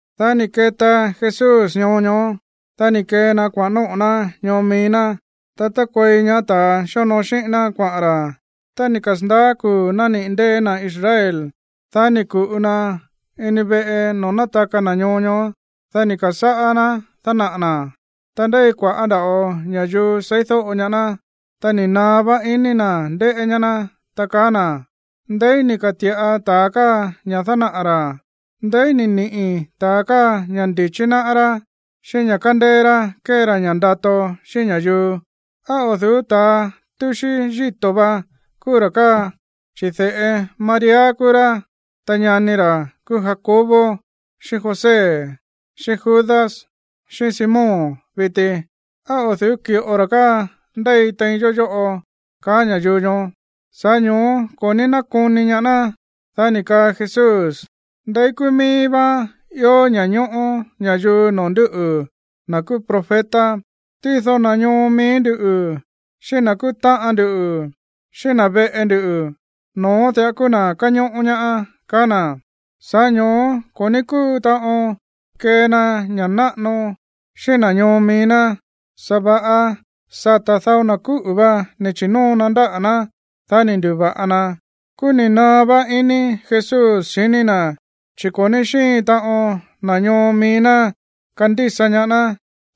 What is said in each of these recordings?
Dá ni̱ keta Jesús ñoo ñoó, dá ni̱ kee na kuaꞌa̱n nóꞌo̱ ná ñoo mií ná, ta tákuei ñaá ta̱a xíonoo xíꞌín ná kuaꞌa̱n ra̱. Tá ni̱ kasa̱ndaá kuu̱ nániꞌi̱ ndée̱ na̱ Israel, dá ni̱ ku̱ꞌu na ini veꞌe noo̱ nátaka na̱ ñoo ñoó. Dá ni̱ ka̱sáꞌá ná dánaꞌa̱ na̱. Ta ndéi kua̱ꞌá nda̱ꞌo ña̱yuu seídóꞌo ñaá ná, ta ni̱ naá vá ini na̱ ndéꞌé ñaá ná, ta kaá na̱: ―¿Ndeí ni̱ ka̱ti̱ꞌa ta̱a káa ña̱ dánaꞌa̱ ra̱? ¿Ndeí ni̱ niꞌi̱ ta̱ káa ña̱ ndi̱chí náꞌá rá, xíꞌín ña̱ kándéé rá kée ra ña̱ ndato xíꞌín ña̱yuu? ¿Á o̱ du̱ú ta̱ túxí yíto̱ vá kúú ra̱ káa, chi̱ de̱ꞌe María kúú rá, ta ñani ra̱ kúú Jacobo xíꞌín José, xíꞌín Judas, xíꞌín Simón viti? ¿Á o̱ du̱ú ki̱ꞌo ra̱ káa ndéi tein yó yóꞌo? ―kaá ña̱yuu ñoó. Sa̱ꞌá ño̱ó ko̱ ní nákoni ñaá ná. Dá ni̱ kaa Jesús: ―Ndeí kúú mií vá ió ña̱ñóꞌó ña̱yuu noo̱ nduꞌu̱, na̱ kúú profeta. Tído na̱ ñoo mií ndú, xíꞌín na̱ kúú táꞌan ndu, xíꞌín na̱ veꞌe ndu, no̱ón diꞌa kúú na̱ káñóꞌó ñaá ―kaá na̱. Sa̱ꞌá ño̱ó ko̱ ní kúu taꞌon kee na ña̱ꞌa náꞌano xíꞌín na̱ ñoo mií ná, sa̱va̱ꞌa sata̱ dao na̱ kúꞌu̱ vá ni̱ chi̱nóo na ndáꞌa̱ ná, dá ni̱ ndu̱va̱ꞌa na. Kúú ni̱ naá vá iní Jesús xiní na̱, chi̱ ko̱ ní xíin taꞌon na̱ ñoo mií ná kandísa ñaá ná.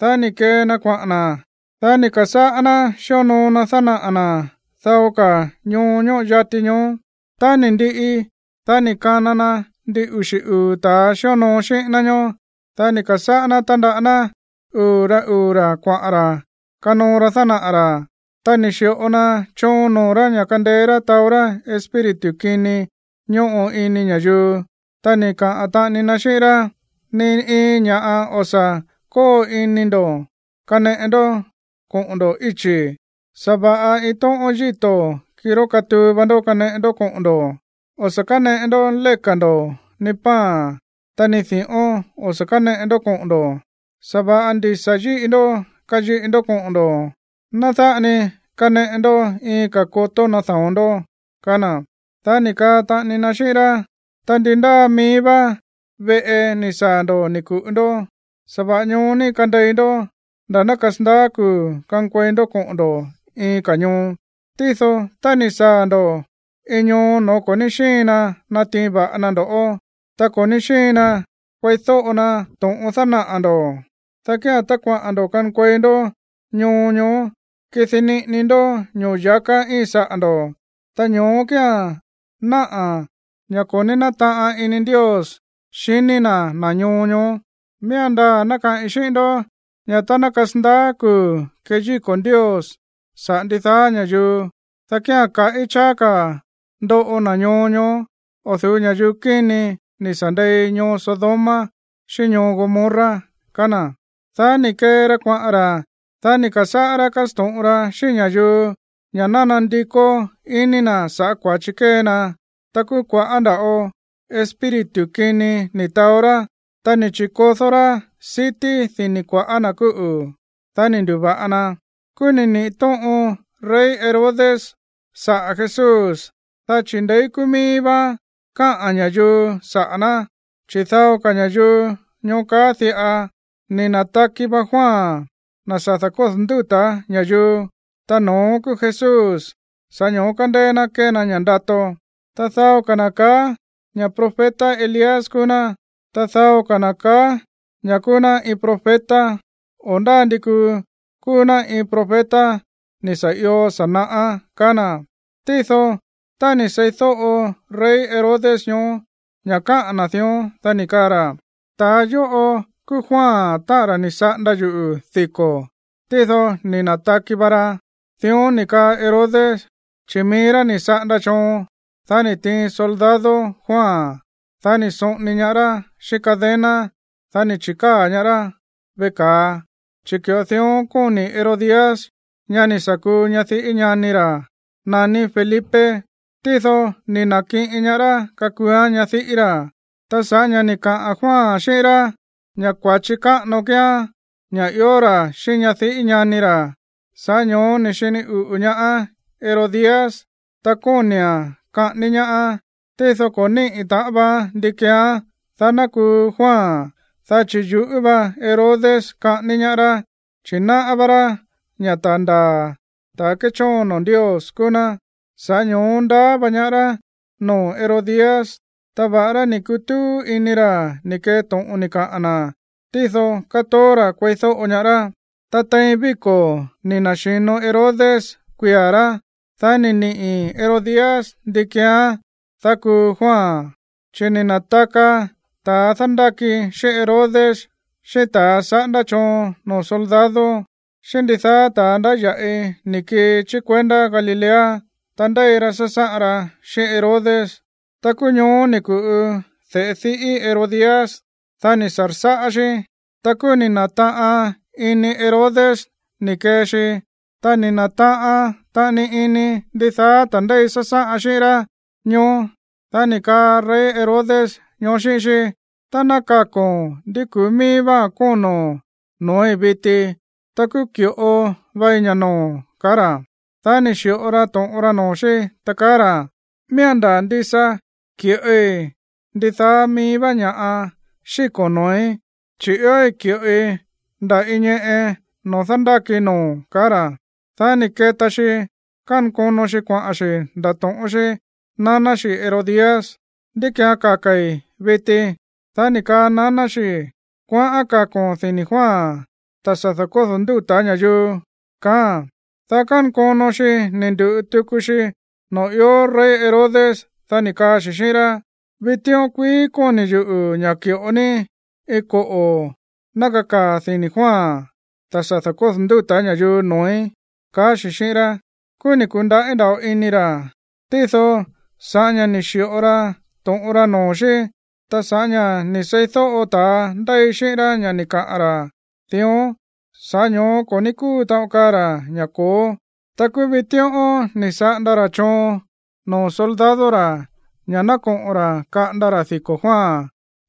Dá ni̱ kee na kuaꞌa̱n na̱. Dá ni̱ ka̱sáꞌá ná xíonoo na dánaꞌa̱ na̱ dao ka̱ ñoo ñóꞌo yati ñoó. Tá ni̱ ndiꞌi, dá ni̱ kana na ndin uxi̱ uu̱ ta̱a xíonoo xíꞌín ná ñóó. Dá ni̱ ka̱sáꞌá ná tándaꞌá ná uu̱ rá uu̱ ra̱ kuaꞌa̱n ra̱ kanoo ra dánaꞌa̱ ra̱. Ta ni̱ xi̱ꞌo na choon noo̱ rá ña̱ kandeé rá taó rá espíritu kini ñóꞌo ini ña̱yuu. Ta ni̱ kaa taꞌani na xíꞌín rá: ―Ni iin ña̱ꞌa o̱ sa̱ kóo ini ndo̱ kaneꞌe ndó koꞌo̱n ndo̱ íchi̱. Sa̱va̱ꞌa iin tóꞌón yíto̱, kirá katuu va ndó, kaneꞌe ndó koꞌo̱n ndo̱. O̱ sa̱ káneꞌe ndó léka̱ ndo̱, ni pan, ta ni di̱ꞌón o̱ sa̱ káneꞌe ndó koꞌo̱n ndo̱. Sa̱va̱ꞌa ndisa̱ yíꞌi ndó kayiꞌi ndó koꞌo̱n ndo̱, ta ná dáꞌa ni kaneꞌe ndó iin ka̱ kotó nada̱on ndó ―kaá na̱. Dá ni̱ kaa taꞌani na xíꞌín rá: ―Ta ndi ndáa mií vá veꞌe ni̱ saa̱ ndo̱ ni̱ ku̱ꞌu ndó, sa̱va̱ꞌa ñoó ni kandei ndó nda̱ ná kasandaá kuu̱ kankuei ndó koꞌo̱n ndo̱ iin ka̱ ñoo. Tído tá ni̱ saa̱ ndo̱ iin ñoo no̱ó ko̱ ní xíin na natiin va̱ꞌa na ndo̱ꞌó, ta ko̱ ní xíin na kueídóꞌo na to̱ꞌon dánaꞌa̱ ndo̱, dá kía̱n tá kuaꞌa̱n ndo̱ kankuei ndó ñoo ñoó, kidi niꞌini ndó ño̱ya̱ká íin saꞌa̱ ndo̱, ta ño̱ó kía̱n náꞌa̱ ña̱ ko̱ nátaꞌan ini Ndios xiní na̱ na̱ ñoo ñoó. Miía̱n ndaa̱ ná kaꞌi̱n xíꞌín ndó ña̱ tá ná kasandaá kuu̱ keyíko̱ Ndios saꞌa̱ ndidaá ña̱yuu, dá kía̱n kaꞌí cháá ka̱ ndoꞌo na̱ ñoo ñoó o̱ du̱ú ña̱yuu kíni ni̱ sa̱ ndei ñoo Sodoma xíꞌín ñoo Gomorra ―kaá na̱. Dá ni̱ kee ra kuaꞌa̱n ra̱. Dá ni̱ ka̱sáꞌá rá kásto̱ꞌon ra xíꞌín ña̱yuu ña̱ ná nandikó iní na̱ saꞌa̱ kua̱chi kée na. Ta kúú kua̱ꞌá nda̱ꞌo espíritu kini ni̱ taó rá, ta ni̱ chi̱kodó rá sití dini̱ kua̱ꞌá na̱ kúꞌu̱, dá ni̱ ndu̱va̱ꞌa na. Kúú ni̱ niꞌi̱ tóꞌon rey Herodes saꞌa̱ Jesús, dá chi̱ ndeí kúú míí vá káꞌa̱n ña̱yuu saꞌa̱ ná. Chi̱ dao ña̱yuu ñoó kaá diꞌa: “Ni̱ na̱taki va Juan, na̱ sa̱ da̱kódo̱ ndúta̱ ña̱yuu, ta no̱ón kúú Jesús, sa̱ꞌá ño̱ó kándéé ná kée na ña̱ꞌa ndato.” Ta dao ka̱ na̱ kaá ña̱ profeta Elías kúú ná. Ta dao ka̱ na̱ ka̱á ña̱ kúú ná iin profeta, o ndá ndi kuu kúú ná iin profeta ni̱ sa̱ io sa̱ naꞌá, kaá na̱. Tído tá ni̱ seídóꞌo rey Herodes ñoó ña̱ káꞌa̱n na̱ dión, dá ni̱ kaa ra̱: ―Ta̱a yóꞌo kúú Juan, táꞌa̱n ra̱ ni̱ saꞌanda yuꞌu̱ diko̱. Tído ni̱ na̱taki va ra. Dión ni̱ kaa Herodes, chi̱ mií rá ni̱ saꞌanda choon, dá ni̱ tiin soldado Juan. Dá ni̱ soꞌoni ñaá rá xíꞌín cadena. Dá ni̱ chi̱káa̱ ñaá rá veꞌe ka̱a, chi̱ ki̱ꞌo dión kóni̱ Herodías, ñá ni̱ sa̱ kuu ñadiꞌí ñani ra̱ naní Felipe, tído ni̱ na̱kiꞌin ñaá rá kakuuán ñadiꞌí ra̱. Ta sa̱ꞌá ña̱ ni̱ kaa Juan xíꞌín rá ña̱ kua̱chi káꞌano kíán ña̱ ió ra̱ xíꞌín ñadiꞌí ñani ra̱, sa̱ꞌá ño̱ó ni̱ xini uꞌu̱ ñaá Herodías, ta kóni̱a̱n kaꞌání ñaáán. Tído ko̱ níꞌi̱ taꞌan vaán ndí keeán, dá ná kuu Juan, dá chi̱ yuꞌú va Herodes kaꞌání ñaá rá, chi̱ náꞌá vá rá ña̱ ta̱ ndaa̱, ta̱ kéchóon noo̱ Ndios kúú ná. Sa̱ꞌá ño̱ó ndaá vá ñaá rá noo̱ Herodías. Ta va̱ꞌará ni̱ kutúú iní ra̱ ni̱ kee to̱ꞌon ni̱ kaꞌa̱n na̱, tído kátoó ra̱ kueídóꞌo ñaá rá. Ta tein víko̱ ni̱ na̱xi̱no Herodes kuia̱ rá, dá ni̱ niꞌi̱ Herodías ndí keeán, dá kuu Juan. Chi̱ ni̱ na̱taka ta̱a dándáki xíꞌín Herodes, xíꞌín ta̱a saꞌándá choon noo̱ soldado, xíꞌín ndidaá ta̱a ndáya̱ꞌi ni̱ kii chí kuendá Galilea, ta ndéi ra sásáꞌan ra xíꞌín Herodes. Ta kúú ñoó ni̱ ku̱ꞌu de̱ꞌe diꞌí Herodías. Dá ni̱ sa̱rsáꞌá xí. Ta kúú ni̱ na̱taꞌan ini Herodes ni̱ kee xi, ta ni̱ na̱taꞌan taꞌani ini ndidaá ta̱ ndéi sásáꞌan xíꞌín rá ñóó. Dá ni̱ kaa rey Herodes ñoó xíꞌín xí: ―Tá ná kako̱n ndí ku̱ú míí váa̱n kóno̱n noo̱í viti, ta kúú ki̱ꞌo vei ña̱ noo̱o̱n ―kaá ra̱. Dá ni̱ xi̱ꞌo ra to̱ꞌon ra noo̱ xí, ta kaá ra̱: ―Miía̱n ndaa̱ ndisa ki̱ꞌoi ndidaá mií vá ña̱ꞌa xíko̱n noo̱í, chi̱ iói̱ ki̱ꞌoi nda̱ iin ñeꞌe noo̱ dándákii noo̱o̱n ―kaá ra̱. Dá ni̱ keta xi kankono xi kuaꞌa̱n xi̱ ndato̱ꞌón xí naná xi Herodías: ―¿Ndí ki̱án kaka̱i̱ viti? Dá ni̱ kaa naná xi: ―Kuaꞌán kako̱n dini̱ Juan, ta̱ sa̱ da̱kódo̱ ndúta̱ ña̱yuu ―kaáa̱n. Dá kánkono xi ni̱ ndu̱ꞌu tuku xi noo̱ ió rey Herodes. Dá ni̱ kaa xi̱ xíꞌín rá: ―Vitíꞌón kuií kóni̱ yuꞌu̱ ña̱ ki̱ꞌo ní iin koꞌo̱ ná kakaa̱ dini̱ Juan, ta̱ sa̱ da̱kódo̱ ndúta̱ ña̱yuu, noo̱í. Kúú ni̱ ku̱ndaꞌí nda̱ꞌo ini ra̱, tído sa̱ꞌá ña̱ ni̱ xi̱ꞌo ra to̱ꞌon ra noo̱ xí, ta sa̱ꞌá ña̱ ni̱ seídóꞌo ta̱a ndéi xíꞌín rá ña̱ ni̱ kaꞌa̱n ra̱ dión, sa̱ꞌá ño̱ó ko̱ ní kúu taꞌon kaa ra̱ ña̱ ko̱ó. Ta kúú vitíꞌón ni̱ saꞌanda ra̱ choon noo̱ soldado ra̱ ña̱ ná koꞌo̱n ra̱ kaꞌanda ra̱ diko̱ Juan,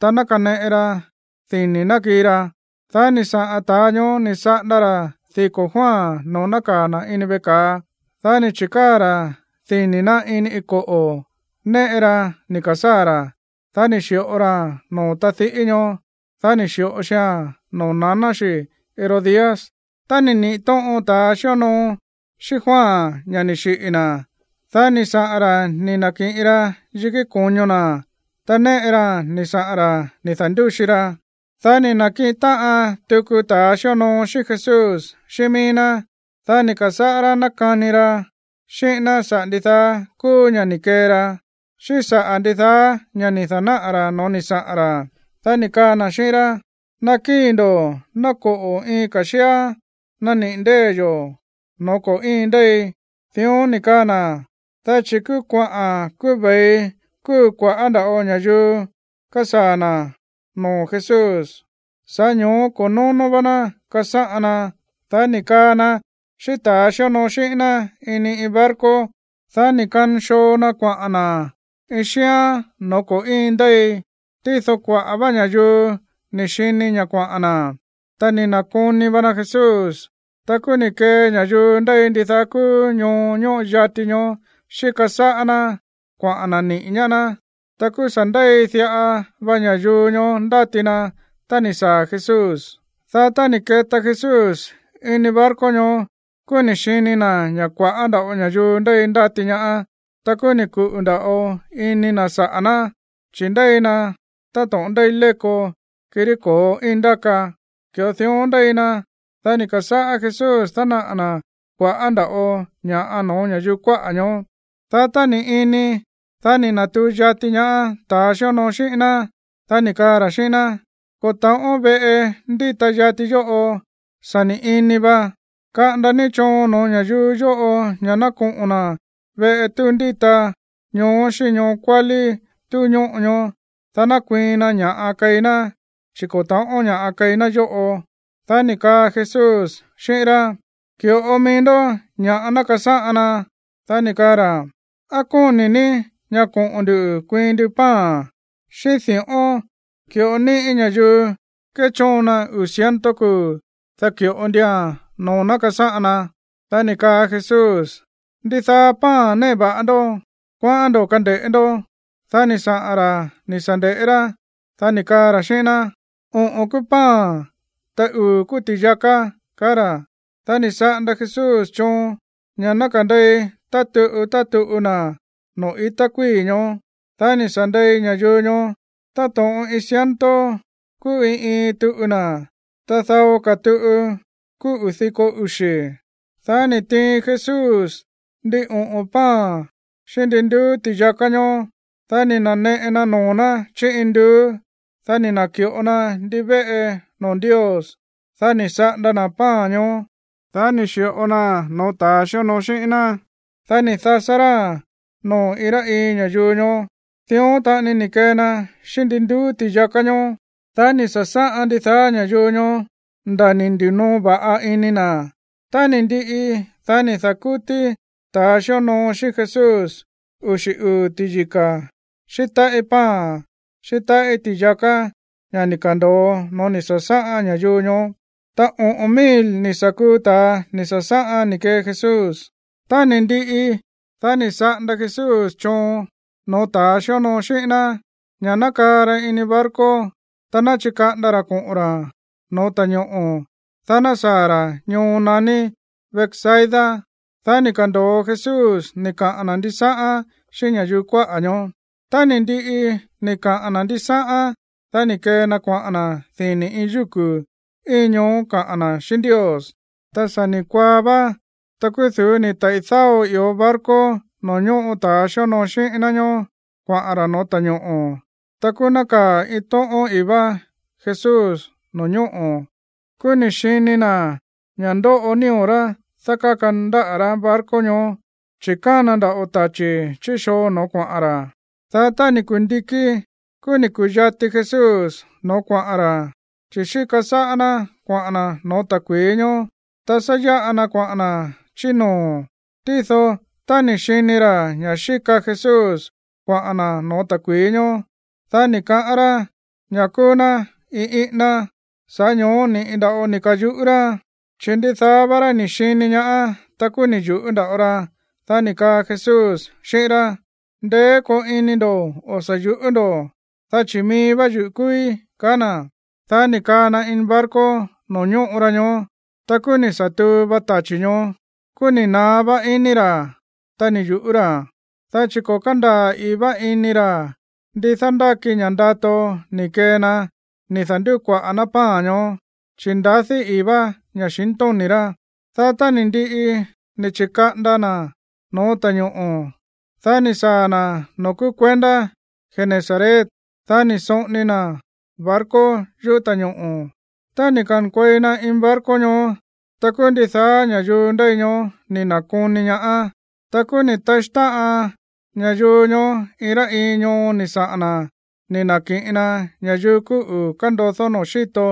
ta ná kaneꞌe ra dini̱ ná kii ra. Dá ni̱ saꞌa̱n ta̱a ñoó ni̱ saꞌanda ra̱ diko̱ Juan noo̱ nákaa̱ na̱ ini veꞌe ka̱a. Dá ni̱ chi̱káa̱ ra̱ dini̱ ná ini iin koꞌo̱ néꞌe raa̱n ni̱ ka̱sáa̱ ra̱. Dá ni̱ xi̱ꞌo raa̱n noo̱ tadiꞌí ñoó. Dá ni̱ xi̱ꞌo xia̱n noo̱ naná xi Herodías. Tá ni̱ niꞌi̱ tóꞌon ta̱ xíonoo xíꞌín Juan ña̱ ni̱ xiꞌi̱ na̱, dá ni̱ saꞌa̱n ra̱ ni̱ na̱kiꞌin ra yikí ko̱ño na̱. Ta néꞌe raa̱n ni̱ saꞌa̱n ra̱ ni̱ da̱ndúxi ra. Dá ni̱ na̱kiꞌin táꞌan tuku ta̱a xíonoo xíꞌín Jesús xíꞌín míí ná. Dá ni̱ ka̱sáꞌá rá nákani ra xíꞌín ná saꞌa̱ ndidaá kúú ña̱ ni̱ kee ra, xíꞌín saꞌa̱ ndidaá ña̱ ni̱ da̱náꞌa̱ ra̱ no̱ó ni̱ saꞌa̱n ra̱. Dá ni̱ kaa na̱ xíꞌín rá: ―Nakíi̱ ndo̱, ná koꞌo̱ iin ka̱ xíán naniꞌi̱ ndée̱ yo̱ no̱ó ko̱ íin ndéi. Dión ni̱ kaa na̱, dá chi̱ kúú kuaꞌa̱n, kúú ve̱i kúu kua̱ꞌá nda̱ꞌo ña̱yuu kásaa̱ na̱ noo̱ Jesús, sa̱ꞌá ño̱ó ko̱ nóno̱ vá ná kasáꞌan na. Dá ni̱ kaa na xíꞌín ta̱a xíonoo xíꞌín ná ini iin barco, dá ni̱ kanxoo na kuaꞌa̱n na̱ iin xíán no̱ó ko̱ íin ndéi. Tído kuaꞌa̱ vá ña̱yuu ni̱ xini ña̱ kuaꞌa̱n na̱, ta ni̱ na̱koni va na Jesús. Ta kúú ni̱ kee ña̱yuu ndéi ndidaá kúú ñoo ñóꞌo yati ñoó xíka sáꞌá ná kuaꞌa̱n na̱ niꞌi̱ ñaá ná. Ta kúú sa̱ ndéi diꞌa va ña̱yuu ñoó ndáti na tá ni̱ saa̱ Jesús. Dá tá ni̱ keta Jesús ini barco ñoó, kúú ni̱ xini na̱ ña̱ kua̱ꞌá nda̱ꞌo ña̱yuu ndéi ndáti ñaá. Ta kúú ni̱ kuꞌu̱ nda̱ꞌo ini na̱ saꞌa̱ ná, chi̱ ndéi na táto̱ꞌon ndéi léko, kirí ko̱ íin ndáka, ki̱ꞌo dión ndéi na. Dá ni̱ ka̱sáꞌá Jesús dánaꞌa̱ na̱ kua̱ꞌá nda̱ꞌo ña̱ꞌa no̱ó ña̱yuu kuáꞌa̱ ñoó. Dá tá ni̱ ini, dá ni̱ na̱tuu yati ñaá ta̱ xíonoo xíꞌín ná. Dá ni̱ kaa ra̱ xíꞌín ná: ―Ko̱ ta̱ꞌón veꞌe ndíta yati yóꞌo, ta sa̱ ni̱ ini va. Kaꞌanda ní choon no̱ó ña̱yuu yóꞌo ña̱ ná koꞌo̱n na̱ veꞌe túu ndíta káa xíꞌín ñoo kuálí túu ñóꞌo káa, dá ná kuiin na ña̱ꞌa keí ná, chi̱ ko̱ ta̱ꞌón ña̱ꞌa keí ná yóꞌo. Dá ni̱ kaa Jesús xíꞌín rá: ―Ki̱ꞌo ni mií ndó ña̱ꞌa ná kasáꞌan na. Dá ni̱ kaa ra̱: ―¿Á kóni̱ ní ña̱ koꞌo̱n ndu̱ kuiin ndu pan xíꞌín di̱ꞌón, ki̱ꞌo níꞌi̱ ña̱yuu kéchóon na uu̱ ciento kuu̱, dá ki̱ꞌo ndua̱n noo̱ ná kasáꞌan na? Dá ni̱ kaa Jesús: ―¿Ndidaá pan néꞌe va̱ꞌa ndó? Kuaꞌán ndo̱ kande̱ꞌé ndó. Dá ni̱ saꞌa̱n ra̱ ni̱ sa̱ nde̱ꞌé rá. Dá ni̱ kaa ra̱ xíꞌín ná: ―Oꞌo̱n kúú pan, ta uu̱ kúú ti̱yaká ―kaá ra̱. Dá ni̱ saꞌanda Jesús choon ña̱ ná kande̱i tá tuꞌu tá tuꞌu na̱ noo̱ i̱tá kuíi̱ ñoó. Dá ni̱ sa̱ nde̱i ña̱yuu ñoó. Táto̱ꞌon iin ciento kúú iin iin tuꞌu na̱, ta dao ka̱ tuꞌu kúú uu̱ diko uxi̱. Dá ni̱ tiin Jesús ndin oꞌo̱n pan xíꞌín ndin nduú ti̱yaká ñóó. Dá ni̱ na̱neꞌe noo̱ ná chí induú. Dá ni̱ na̱ki̱ꞌo na ndivéꞌe noo̱ Ndios. Dá ni̱ saꞌanda na̱ pan ñoó. Dá ni̱ xi̱ꞌo naa̱n no̱ó ta̱ xíonoo xíꞌín ná. Dá ni̱ dasá ráa̱n noo̱ iin rá iin ña̱yuu ñoó. Dión taꞌani ni̱ kee na xíꞌín ndin nduú ti̱yaká ñóó. Dá ni̱ sa̱sáꞌan ndidaá ña̱yuu ñoó nda̱ ni̱ ndi̱noo va̱ꞌa ini na̱. Tá ni̱ ndiꞌi, dá ni̱ da̱kútí ta̱ xíonoo xíꞌín Jesús uxi̱ uu̱ ti̱yika̱ xíꞌín táꞌí pan, xíꞌín táꞌí ti̱yaká ña̱ ni̱ ka̱ndo̱o noo̱ ni̱ sa̱sáꞌan ña̱yuu ñoó. Ta oꞌo̱n mil ni̱ sa̱ kuu ta̱a ni̱ sa̱sáꞌan ni̱ kee Jesús. Tá ni̱ ndiꞌi, dá ni̱ saꞌanda Jesús choon no̱ó ta̱a xíonoo xíꞌín ná ña̱ ná kaa ra ini barco, ta ná chikaꞌanda ra koꞌo̱n ra̱ no̱ó ta̱ñoꞌo̱, dá ná saa̱ ra̱ ñoo naní Betsaida. Dá ni̱ ka̱ndo̱o Jesús ni̱ kaꞌa̱n na̱ ndisáꞌán xíꞌín ña̱yuu kuáꞌa̱ ñoó. Tá ni̱ ndiꞌi ni̱ kaꞌa̱n na̱ ndisáꞌán, dá ni̱ kee na kuaꞌa̱n na̱ dini̱ iin yúku̱ íin ñoó kaꞌa̱n na̱ xíꞌín Ndios. Tá sa̱ ni̱ kuaá vá, ta kúú du̱ú ni̱ taꞌi̱ dáo ió barco noo̱ ñóꞌo ta̱a xíonoo xíꞌín ná ñoó kuaꞌa̱n ra̱ no̱ó ta̱ñoꞌo̱. Ta kúú nákaa̱ iin tóꞌón i̱í vá Jesús no̱ñóꞌo̱. Kúú ni̱ xini na̱ ña̱ ndóꞌo nío̱ rá dákáka ndáꞌa̱ rá barco ñoó, chi̱ kána nda̱ꞌo tachi̱ chí xoo no̱ó kuaꞌa̱n ra̱. Dá tá ni̱ kundikí, kúú ni̱ ku̱yati Jesús no̱ó kuaꞌa̱n ra̱, chi̱ xíka sáꞌá ná kuaꞌa̱n na̱ no̱ó ta̱kui̱í ñoó, ta sá yáꞌa na kuaꞌa̱n na̱ chí noo̱. Tído tá ni̱ xini ra̱ ña̱ xíka Jesús kuaꞌa̱n na̱ no̱ó ta̱kui̱í ñóó, dá ni̱ kaꞌán rá ña̱ kúú ná iin íꞌíná. Sa̱ꞌá ño̱ó ni̱ꞌi nda̱ꞌo ni̱ ka̱yuꞌú rá, chi̱ ndidaá vá rá ni̱ xini ñaá, ta kúú ni̱ yu̱ꞌú nda̱ꞌo ra. Dá ni̱ kaa Jesús xíꞌín rá: ―Ndeé koo ini ndo̱. O̱ sa̱ yuꞌú ndo̱, dá chi̱ mií vá yuꞌu̱ kúúí ―ka̱á na̱. Dá ni̱ kaa na ini barco noo̱ ñóꞌo ra ñoó. Ta kúú ni̱ sa̱ tuu vá tachi̱ ñoó. Kúú ni̱ naá vá iní ra̱, ta ni̱ yu̱ꞌú ra̱, dá chi̱ ko̱ kándaa̱ i̱í vá ini ra̱ ndi dándáki ña̱ ndato ni̱ kee na ni̱ da̱ndukuaꞌa̱ ná pan ñoó, chi̱ ndadí i̱í vá ña̱xintóni̱ rá. Dá tá ni̱ ndiꞌi ni̱ chi̱kaꞌanda na̱ no̱ó ta̱ñoꞌo̱, dá ni̱ saa̱ na̱ noo̱ kúú kuendá Genesaret. Dá ni̱ soꞌoni na̱ barco yuꞌú ta̱ñoꞌo̱. Tá ni̱ ka̱nkuei na ini barco ñoó, ta kúú ndidaá ña̱yuu ndéi ñoó ni̱ na̱koni ñaá. Ta kúú ni̱ taxí táꞌan ña̱yuu ñoó iin rá iin ñoo ni̱ saꞌa̱n na̱ ni̱ na̱kiꞌin na ña̱yuu kúꞌu̱ kándodó noo̱ xíto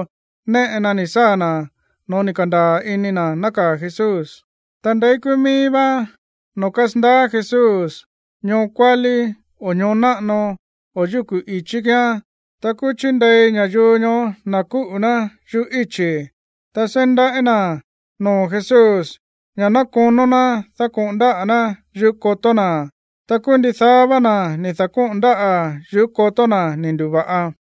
néꞌe na ni̱ saa̱ na̱ no̱ó ni̱ ka̱ndaa̱ ini na̱ nákaa̱ Jesús. Ta ndeí kúú míí vá noo̱ kásandaá Jesús, ñoo kuálí o ñoo náꞌano o yukú ichí kíán, ta kúú chíndei ña̱yuu ñoó na̱ kúꞌu̱ ná yuꞌú íchi̱, ta seí ndaꞌí na̱ noo̱ Jesús ña̱ ná konó ná dákoꞌo̱n ndáꞌa̱ ná yuꞌú kotó na̱. Ta kúú ndidaá vá na̱ ni̱ da̱kóꞌo̱n ndáꞌa̱ yuꞌú kotó na̱ ni̱ ndu̱va̱ꞌa.